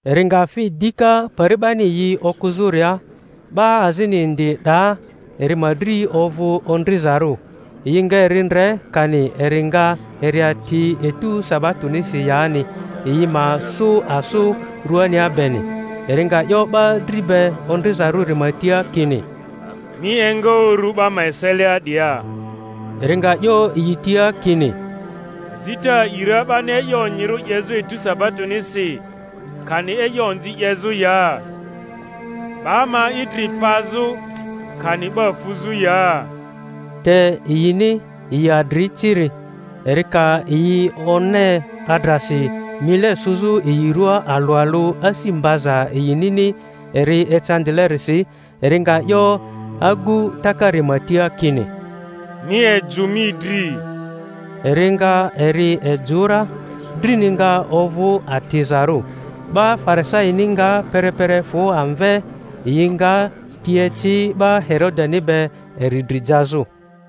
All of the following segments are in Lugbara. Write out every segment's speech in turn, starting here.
Eri nga fi dika pari 'bani yi okᴜzᴜria; 'ba azini indi 'daa, eri ma dri ovᴜ ondrizarᴜ. Yi nga eri ndre kani eri nga eri ati etu sabatonisi yani, yi ma sᴜ asᴜ ruania beni. Eri nga 'yo 'ba dri be ondrizarᴜri ma tia kini, Mi enga uru 'ba ma eselia 'dia. Eri nga 'yo yi tia kini, Azita a'i ra 'bani e'yo onyirᴜ 'yezᴜ etu sabatonisi, kani e'yo onzi 'yezᴜ ya? 'Ba ma idri pazᴜ, kani 'ba fuzᴜ ya? Te yini, yi adri ciri. Eri ka yi one adrasi, mile sᴜzᴜ yi ruaa alᴜ alᴜ, asi mbaza yinini eri ecandilerisi, eri nga 'yo agu takari ma tia kini, Mi ejᴜ mi dri. Eri nga eri ejᴜ ra, drini nga ovᴜ atizarᴜ. 'Ba Farisaini nga perepere fᴜ amve, yi nga ti eci 'ba Herodeni be eri dri jazᴜ.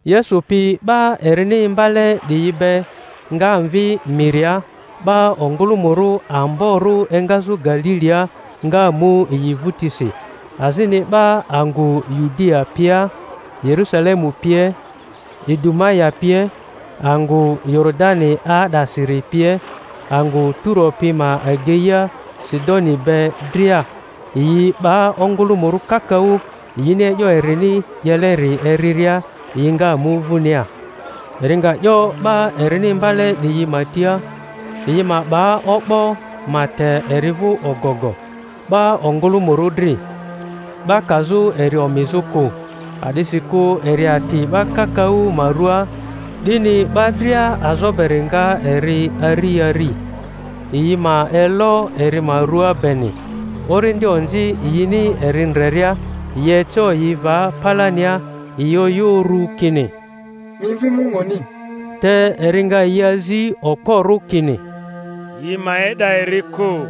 Yesu pi 'ba erini imbale 'diyi be nga mvi miria; 'ba ongᴜlᴜmᴜrᴜ amborᴜ engazᴜ Galilia nga mu yi vᴜtisi, azini 'ba angᴜ Yudia pia, Yerusalemu pie, Idumaya pie, angᴜ Yoridani 'aa'dasiri pie, angᴜ Turo pi ma ageia Sidoni be dria, yi 'ba ongᴜlᴜmᴜrᴜ kakaᴜ, yini e'yo erini 'yeleri eriria, yi nga mu vᴜnia. Eri nga 'yo 'ba erini imbale 'diyi ma tia, yi ma 'ba o'bo ma te eri vᴜ ogogo 'ba ongᴜlᴜmᴜrᴜ dri, 'ba kazᴜ eri omizᴜ kᴜ; a'disikᴜ eri ati 'ba kakaᴜ ma rua, 'dini 'ba dria azo beri nga eri ari ari, yi ma elo eri ma rua beni. Orindi onzi, yini eri ndreria, yi eco yi va palania, yi oyᴜ uru kini, Mi Mvi Munguni. Te eri nga yi azi okporᴜ, kini, yi ma e'da eri kᴜ.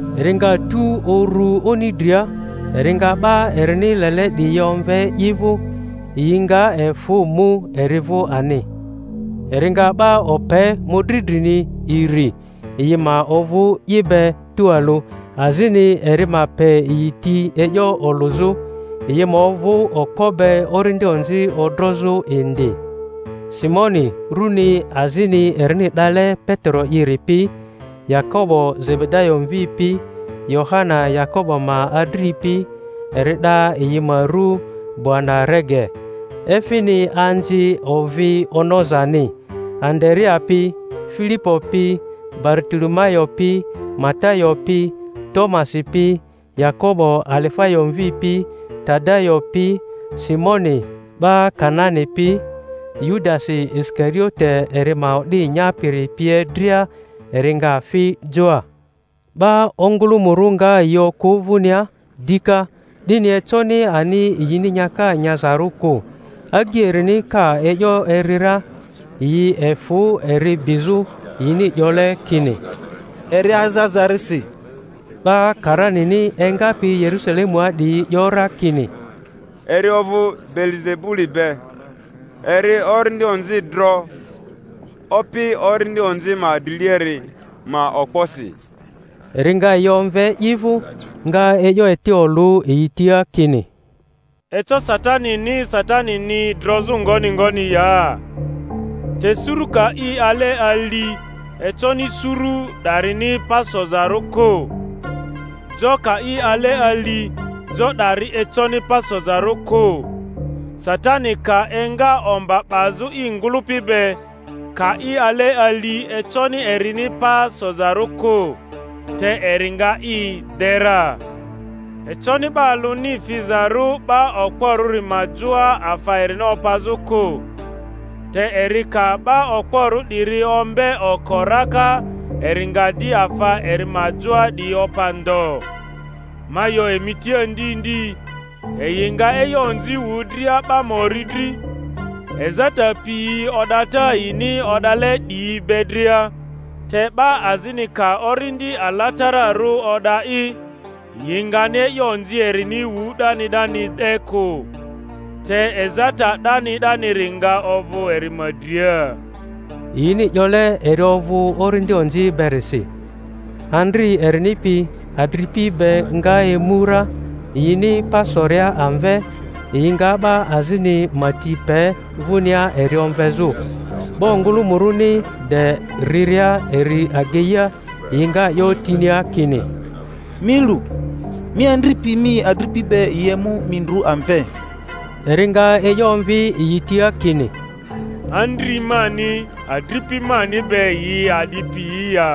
Eri nga tu uru oni dria, eri nga 'ba erini lele 'diyi omve i vᴜ; yi nga efᴜ mu eri vᴜ ani. Eri nga 'ba ope mᴜdri drini iri, yi ma ovᴜ i be tualᴜ, azini eri ma pe yi ti e'yo olᴜzᴜ, yi ma ovᴜ okpo be orindi onzi odrozᴜ indi: Simoni, runi azini erini 'dale Petero'iri pi; Yakobo Zebedayo mvi pi, Yohana Yakobo ma adri pi, eri 'da yi ma ru Boanerege, efini Anzi ovi onozani; Andarea pi, Filipo pi, Baritolomayo pi, Matayo pi, Tomasi pi, Yakobo Alifayo mvi pi, Tadayo pi, Simoni 'ba Kanani pi, Yudasi Isikariote eri ma o'di nyapiri pie dria. Eri nga fi joa. 'Ba ongᴜlᴜmᴜrᴜ nga yi okᴜ vᴜnia dika, 'dini econi ani yini nyaka nyazarᴜ kᴜ. Agyi erini ka e'yo eri ra, yi efᴜ eri bizᴜ, yini 'yole kini, Eri aza aza-risi. 'Ba karanini engapi Yerusalemua 'diyi 'yo ra kini, Eri ovᴜ Beelizebuli be, eri orindi onzi dro opi orindi onzi ma driliari ma okposi. Eri nga yi omve i vᴜ, nga e'yo eti olᴜ yi tia kini, Eco Satanini Satanini drozᴜ ngoni ngoni ya? Te suru ka i ale ali, econi suru 'darini pa sozarᴜ kᴜ. Jo ka i ale ali, jo 'dari econi pa sozarᴜ kᴜ. Satani ka enga omba 'bazᴜ i ngᴜlᴜpi be, ka i ale ali, econi erini pa sozarᴜ kᴜ, te eri nga i de ra. Econi 'ba alᴜni fizarᴜ 'ba okporᴜri ma joa afa erini opazᴜ kᴜ, te eri ka 'ba okporᴜ 'diri ombe oko raka eri nga di afa eri ma joa 'diyi opa ndo. Ma 'yo emi tia ndi ndi, yi nga e'yo onzi wu dria 'ba ma ori dri, ezata piyi o'data yini o'dale 'diyi be dria; te 'ba azini ka Orindi Alatararᴜ o'da'i, yi ngani e'yo onzi erini wu 'dani 'dani 'de kᴜ, te ezata 'dani 'daniri nga ovᴜ eri ma dria— yini 'yole eri ovᴜ orindi onzi berisi. Andri erini pi adripi be nga emu ra; yini pa soria amve, yi nga 'ba azini ma ti pe vᴜnia eri omvezᴜ. 'Ba ongᴜlᴜmᴜrᴜni de riria eri ageia, yi nga 'yo tinia kini, Mi lu, mi andri pi mi adripi be yi emu mi ndru amve. Eri nga e'yo omvi yi tia kini, Andri mani adripi mani be yi a'di piyi ya?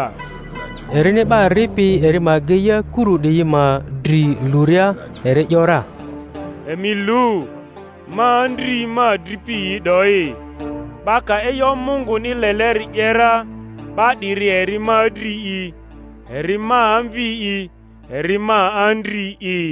Erini 'ba ripi eri ma ageia kuru 'diyi ma dri luria, eri 'yo ra, Emi lu, ma andri ma adripi yi 'doyi! 'Ba ka e'yo Munguni leleri 'ye ra, 'ba 'diri eri ma adri'i, eri ma amvi'i, eri ma andri'i.